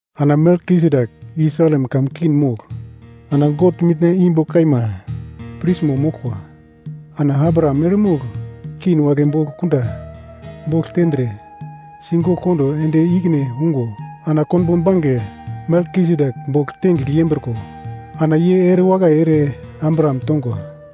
Ana Melkisedek i Salem kamun king mogl ana God Mitna imbo kaima prismo moglkwa. Ana Abraham eremogl king wagle bogl kunda bogl tendre sigogl kondo ende ikine ungo ana konbo bange Melkisedek bogl tengigl yembriko ana ye ere wakai ere Abraham tongwa.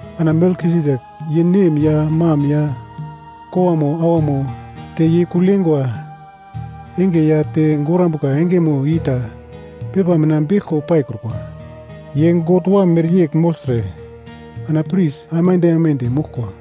Ana Melkisedek ye nem ya mam ya kowamo awamo te ye kugl yeingwa enge ya te gorambuka engemo i ta pepa mina beglko paikrukwa. Ye God Wam mereyegl mogltre ana pris aimande aimande moglkwa.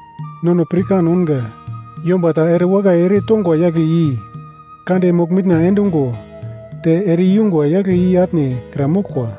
Nono pirkan ounga, yomba ta ere wakai ere tongwa yagle i kande mogl-mitna endugo te ere ingwa yagle i atne kra moglkwa.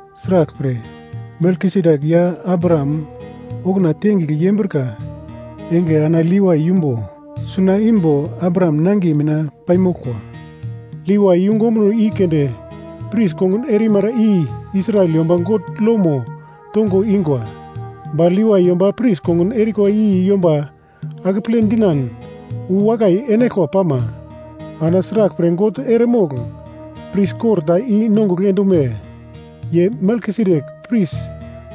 Sraglpre, Melkisedek ya Abraham okuna tengigl yembrika enge ana Levai yumbo suna imbo Abraham nangiye mina paimoglkwa. Levai yungu ombuno i keunde pris kongun erimara i Israel yomba God lomo tongo ingwa. Ba Levai yomba pris kongun erikwa i yomba akeple dinan uwakai enaglkwa pama, ana sraglpre God eremogl pris kor ta i-nongugl endume? Ye Melkisedek pris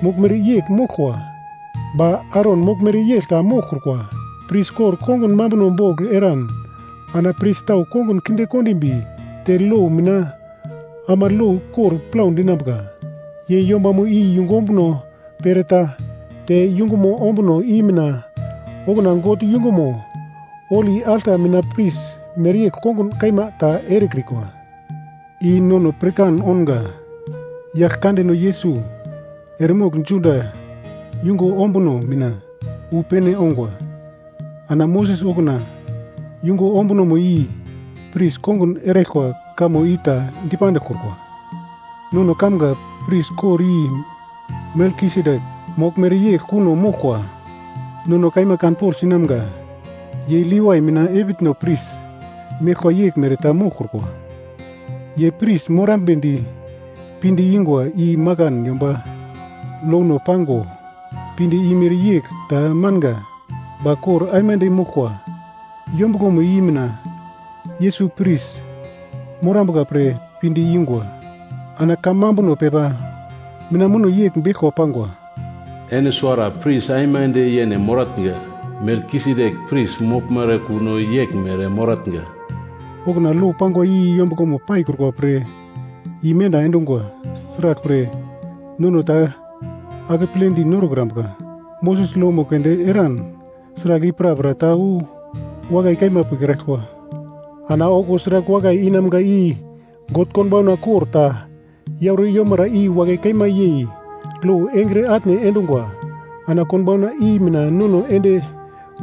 moglmere yegl moglkwa, ba Aron moglmere yegl ta moglkrukwa. Pris kor kongun mambuno bogl eran ana pris tau kongun kinde kondimbi te lo mina ama lo kor plau dinambuka. Ye yombamo i yungu ombuno pereta, te yungumo ombuno i mina okuna God yungumo holi alta mina pris mereyegl kongun kaima ta erekrikwa. I nono pirkan ounga, Yaglkandeno Yesus eremogl Juda yungu ombuno mina wu pene ounga, ana Moses okuna yungu ombunomo i pris kongun eraglkwa kamo ita dipandiglkrukwa. Nono kamga pris kor i Melkisedek moglmere yegl kuno moglkwa. Nono kaima kanpogl sinamga. Ye Levai mina epitno pris meglkwa yeglmere ta moglkrukwa. Ye pris morambedi pinde ingwa i makan yomba lono pango pinde imere yegl ta manga. Ba kor aimande moglkwa yombuglomo i mina Yesus pris morambuka pre pinde ingwa. Ana kamambuno pepa mina muno yegl beglko pangwa: “Ene suwara pris aimande yene moratnga. Melkisedek pris moglmere kuno yeglmere moratnga.” Okuna lo pangwa i yombuglomo paikrukwa pre, imenda endingwa, sraglpre, nono ta akepledi norokrambuka. Moses lomo keunde eran sragl i prapra ta wu wakai kaima pikraglkwa. Ana okuwo sragl wakai inamga i God konbauna kor ta yauro yomara i wakai kaima yei lo engre atne endungwa ana konbauna i mina nono ende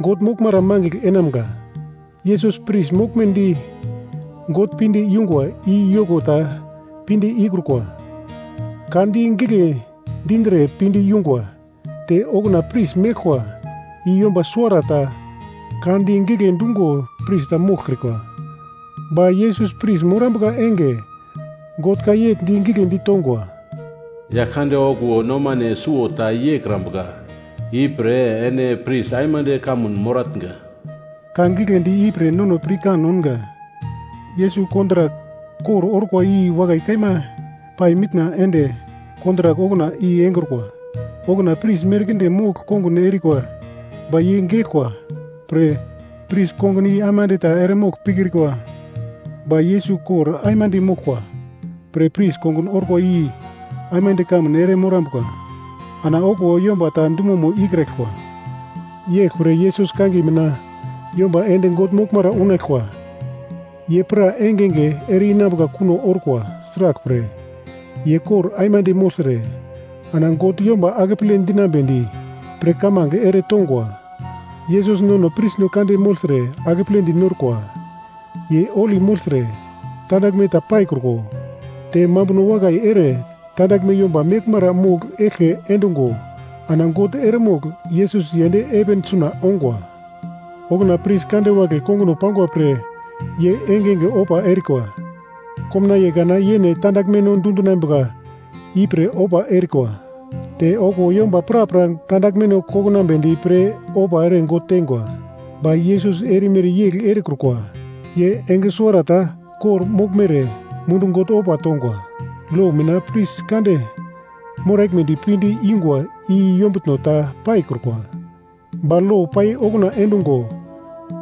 God moglmara mangigl enamga. Yesus pris morambedi God pinde yungwa i yoko ta pinde ikrukwa: Ka di gigle dindre pinde yungwa te okuna pris meglkwa i yomba suwarata ka di gigle dungo pris ta moglkrikwa. Ba Yesus pris morambuka enge, God ka yegl di giglendi tongwa: “Yaglkande okuwo nomane suwo ta yeikrambuka. Ipre ‘Ene pris aimande kamun moratnga.’” Ka giglendi ipre nono pirkan ounga. Yesus kontrak kor orkwa i wakai kaima pai mitna ende kontrak okuna i engrukwa. Okuna pris merkinde mogl kongun erikwa ba ye geglkwa pre pris kongun i aimande ta eremogl pikrikwa. Ba Yesus kor aimande moglkwa pre pris kongun orkwa i aimande kamun ere morambuka. Ana okuwo yomba ta dumomo ikraglkwa. Yeglpre Yesus kangiye mina yomba ende God moglmara unaglkwa ye pra engenge ere-inambuka kuno orkwa. Sraglpre, ye kor aimande mogltre ana God yomba akeple dinambedi pre kamange eretongwa. Yesus nono prisno kande mogltre akepledi norkwa. Ye holi mogltre, tandaglme ta paikruko te mambuno wakai ere tandaglme yomba meglmara mogl eglke endungo ana God eremogl Yesus yend heven suna ongwa. Okuna pris kande wagle konguno pangwa pre ye engenge ofa erikwa. Komnaiye kana yene tandaglmeno dundinambuka i pre ofa erikwa, te okuwo yomba prapra tandaglmeno kokonambedi pre ofa ere God tengwa. Ba Yesus erimere yegl erekrukwa, ye enge suwarata kor-moglmere mundu God ofa tongwa. Lo mina pris kande moraglmedi pinde ingwa i yombutno ta paikrukwa. Ba lo pai okuna endungo,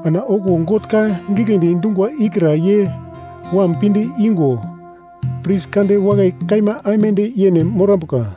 ana okuwo God ka giglendi dungwa ikra ye Wam pinde igo pris kande wakai kaima aimande yene morambuka.